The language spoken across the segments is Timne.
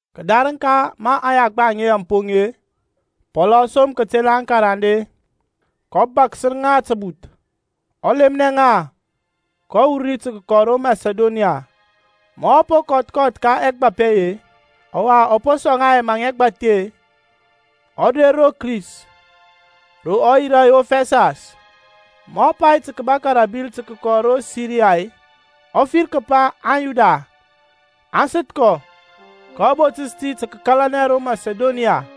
Kədarəŋ ka ma aŋyagba aŋe aŋ poŋ-e, Pɔlȧŋ ɔ som kətela aŋkarande, kɔ bȧkəs ŋa təbuth, ɔ lemnɛ ŋa, kɔ wur ri tə kəkɔ ro Masidoniya. Ma ɔ po kɔth kɔth ka ɛgbap ɛye-e, ɔwa ɔ po sɔŋ ŋa ɛmaŋ ɛgbathi-e, ɔ der ro Kris, ro ɔ yirȧ yof ɛsas. Ma ɔ pai tə kəbȧkȧ rə ȧbil tə kəkɔ ro Siriya-e, ɔ fir kəpa aŋYuda aŋ səth kɔ kɔ botəs tə kəkalanɛ ro Masidoniya.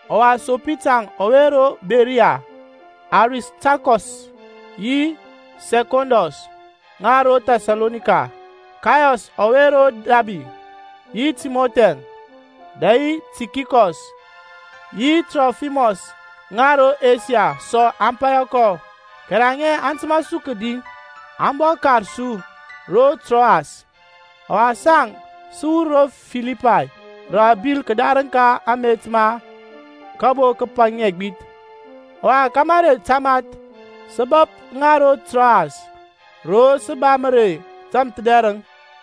Ɔwa Sopita ɔwe ro Beriya, Aristarkɔs yi Sɛkɔndɔs ŋa ro Thɛsalonika, Kayɔs ɔwe ro Dabi, yi Timɔthi-əŋ, dɛ yi Tikikɔs yi Trofimɔs ŋa ro Asia sɔ aŋ paya kɔ. Kɛrɛ aŋe aŋ təmȧ su kədi, aŋ bɔ kar su ro Troas. Ɔwa saŋ sə wur ro Filipay rə abil kədarȧŋ ka amet ma kabo kəpaŋi ɛgbith, ɔwa ka mərey tamath sə bəp ŋa ro Troas, ro sə ba mərey tȧmthədɛrəŋ.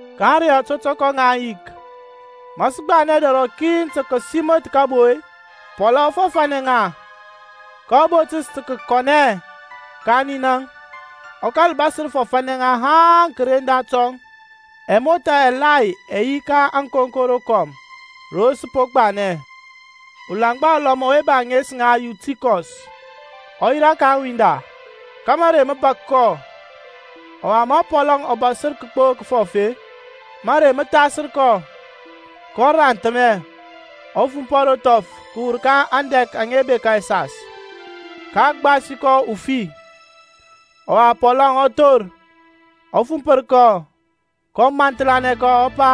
Ka ȧŋrey ȧtɔtɔkɔ ŋa ȧŋyik, ma sə gbanɛ dɛr rɔkin tə kəsiməth kəbo-e, Pɔlȧŋ ɔ fɔfȧnɛ ŋa, kɔ botəs tə kəkɔnɛ ka ninaŋ, ɔ kȧl bȧsər fɔfȧnɛ ŋa haŋ kəren datɔŋ. Ɛmothȧ ɛgbȧthi ɛ yi ka ȧŋkonko rokɔm ro sə po gbanɛ. Ulaŋgba ulɔm ɔwe ba ȧŋes ŋa Yutikɔs ɔ yirȧ ka aŋwinda, ka mərey mə bȧk kɔ, ɔwa ma Pɔl ɔ bȧsər gbo kəfɔf-e, mȧrey mə thasər kɔ, kɔ ranthəmɛ, ɔ fumpɔ ro thɔf kəwur ka andɛk aŋa bekȧ ɛsas, ka a gbasi kɔ ufi. Ɔwa Pɔlȧŋ ɔ thor, ɔ fumpər kɔ, kɔ mampəlanɛ kɔ, ɔ pa,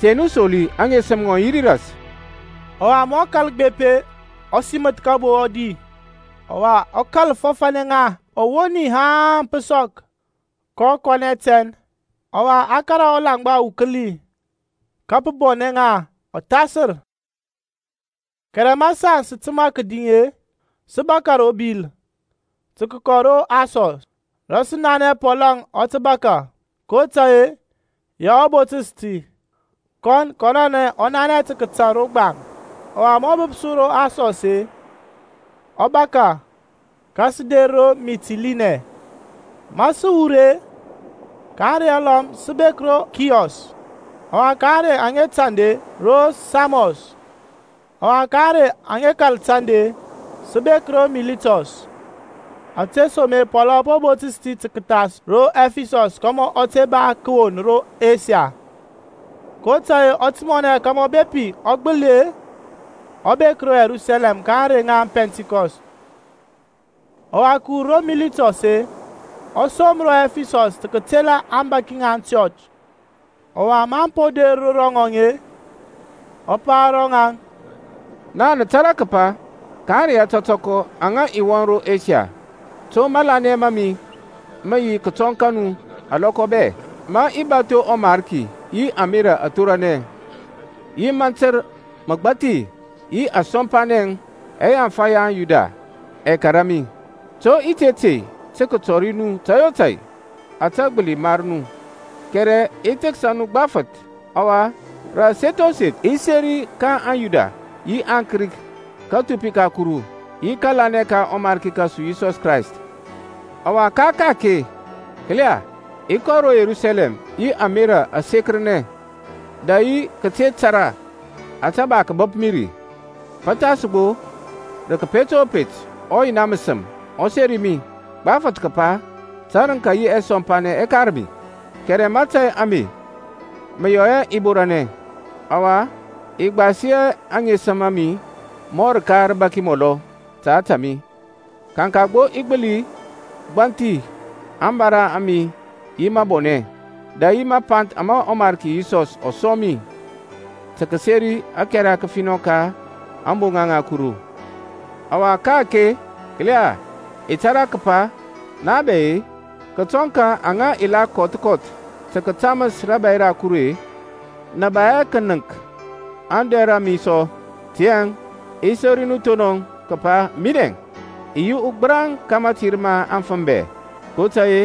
Te nu soli, aŋesəm ŋɔŋ aŋ yi ri ras. Ɔwa ma ɔ kȧl gbep-e, ɔ siməth kabo, ɔ di, ɔwa ɔ kȧl fɔfȧnɛ ŋa ɔwoni haŋ pə sɔk, kɔ kɔnɛ tɛn. Ɔwa aŋ kȧrȧ ɔlaŋgba ukəli, ka pə bɔnɛ ŋa ɔthasər. Kɛrɛ ma saŋ sə təmȧ kədi-e, sə bȧkȧ ro bil tə kəkɔ ro Asɔs, rə sə nanɛ Pɔl ɔ tə bȧkȧ; kotȧy-e ya ɔ botəs ti, kɔn kɔnɔnɛŋ ɔ nanɛ tə kətȧŋ ro gbaŋ. Ɔwa ma ɔ bəp su ro Asɔs-e, ɔ bȧkȧ, ka sə der ro Mitilinɛ. Ma sə wur ri-e, ka ȧŋrey alɔm sə bek ro Kiyɔs; ɔwa ka ȧŋrey aŋa tanda-e, ro Samɔs, ɔwa ka ȧŋrey aŋa kȧl tȧndȧ-e, sə bek ro Militɔs. Ȧtesoma-e Pɔlȧŋ ɔ po botəs ti tə kəthas ro Ɛfisɔs kȧmȧ ɔ te ba kəwon ro Asia; kotȧy-e ɔ timɔnɛ kȧmȧ bepi ɔ gbəli-e, ɔ bek ro Yerusalɛm ka ȧŋrey ŋa Pɛntikɔst. Ɔwa kəwur ro Militɔs-e, ɔ som ro Ɛfisɔs tə kətela aŋbȧki ŋa aŋchɔch. Ɔwa maŋ po der ro rɔŋɔŋ-e, ɔ pa ro ŋaŋ, Naŋ nə tȧrȧ katəp ka ȧŋrey ȧtɔtɔkɔ aŋa i wɔŋ ro Asia, to matanɛ ma mi mə yi kətɔŋ ka nu alɔkɔ bɛ, ma i bȧtho ɔMarki yi ȧmerȧ athoranɛ, yi mantər məgbathi, yi ȧŋsɔmpanɛŋ aŋa ɛyaŋfa ya aŋYuda ɛ kȧrȧ mi; to i te tey tə kətɔri nu tȧy o tȧy ȧtȧ gbəli mar nu, kɛrɛ i thəksa nu gbafəth, ɔwa rə aseth o seth i seri ka aŋYuda yi aŋKrik kathupi ka Kuru, yi kȧlanɛ ka ɔMarki kȧsu Yisɔs Krayst. Ɔwa ka-ake, kəla, i kɔ ro Yerusalɛm yi ȧmerȧ asekəranɛ dɛ yi kəte tȧrȧ ȧtȧ ba kəbəp mi ri; pəthas gbo rə kəpet o pet ɔYina məsəm ɔ seri mi gbafəth kəpa tərəŋka yi ɛsɔmpanɛ ɛ kar mi. Kɛrɛ mȧtȧy ame mə yɔ hɛ i borȧnɛ, ɔwa i gbasi hɛ aŋesəm a mi mɔ rəka rəbaki mɔlɔ ta ȧtȧ mi, kaŋka gbo i gbəli gbanthi ȧŋbara a mi yi məbɔnɛ, dɛ yi mapanth ama ɔMarki Yisɔs ɔ sɔŋ mi, tə kəseri ȧkɛra kəfinɔ ka ȧŋboŋa ŋa Kuru. Ɔwa ka-ake, kəla, i tȧrȧ kəpa na bɛ-e, kətɔŋ ka aŋa i la kɔth kɔth tə kətaməs rȧbȧy ra Kuru-e, nə ba hɛ kənəŋk ader ra mi sɔ. Tiyȧŋ i seri nu thonɔŋ kəpa minɛ i yi ugbəraŋ ka mȧtir ma afəm bɛ. kotȧy-e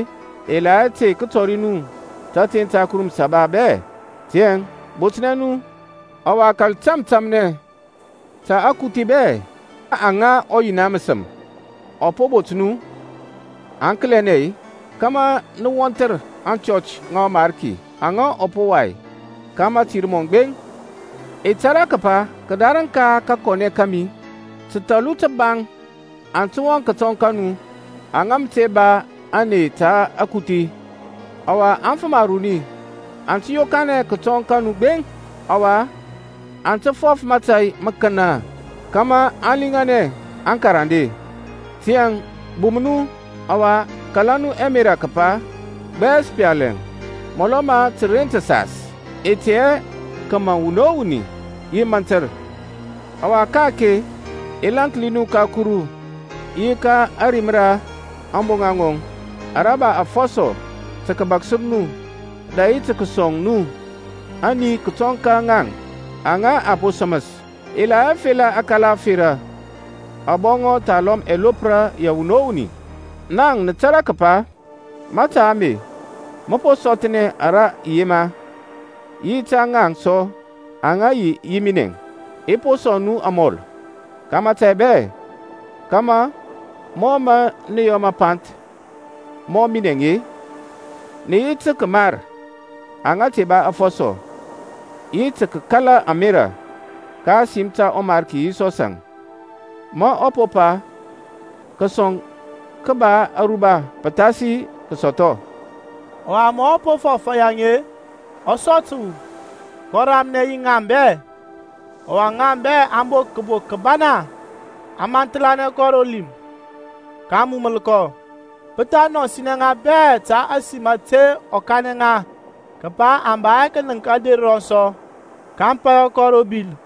i la hɛ tey kətɔri nu tȧteŋ ta Kuru Məsaba bɛ. Tiyȧŋ botnɛ nu, ɔwa kȧl tȧmtȧmnɛ ta akuthi bɛ ka aŋa ɔYina məsəm ɔ po bot nu aŋkəlɛnɛ-e, kȧmȧ nə wɔnthər aŋchɔch ŋa ɔMarki aŋa ɔ po wai ka mȧtir mɔŋ gbeŋ. I tȧrȧ kəpa kədarəŋ ka kakɔnɛ kȧmi təthɔlu təbaŋ aŋ tə wɔŋ kətɔŋ ka nu, aŋa mə te ba ȧney ta akuthi. Ɔwa afəm aruni aŋ tə yokanɛ kətɔŋ ka nu gbeŋ, ɔwa aŋ tə fɔf mȧtȧy məkənə kȧmȧ aŋ liŋanɛ aŋkarande. Tiyȧŋ bum nu, ɔwa kala nu ɛmerȧ kəpa gbɛs pali-əŋ, mɔlɔ ma təren təsas, i tey hɛ kəmaŋ wuni o wuni yi mantər. Ɔwa ka-ake i lȧnki nu ka Kuru yi ka ȧrim ra ȧŋboŋa ŋɔŋ, ara ba afɔsɔ tə kəbaksər nu, dɛ yi tə kəsɔŋ nu ani kətɔŋ ka ŋaŋ aŋa a po səməs. I la hɛ fela akala ȧferȧ, abɔŋɔ thalɔm ɛlopra ya wuni o wuni. Naŋ nə tȧrȧ kəpa mȧta ame mə po sɔthɔnɛ ara i yema, yi ta ŋaŋ sɔ aŋa yi yi minɛŋ. I po sɔŋ nu amɔl ka mȧtȧy bɛ, kȧmȧ mɔ mə nə yɔ məpanth mɔ minɛŋ-e, nə yi tə kəmar aŋa te ba afɔsɔ, yi tə kəkala ȧmerȧ ka ȧsim ta ɔMarki Yisɔsȧŋ ma ɔ pa, Kȧsɔŋ kə ba aruba pəthasi kasɔthɔ. Ɔwa ma ɔ po fɔf yaŋ-e, ɔ sɔ təwu, kɔ ramnɛ yi ŋaŋ bɛ. Ɔwa ŋaŋ bɛ aŋ bok kəbok kəbana, aŋ mampəlanɛ kɔ ro lim, kaŋ muməl kɔ. Pə tha nɔsinɛ ŋa bɛ ta ȧsim ȧte ɔ kanɛ ŋa kəpa aŋ ba hɛ kənəŋk ader rɔŋ sɔ. Kaŋ paya kɔ ro bil.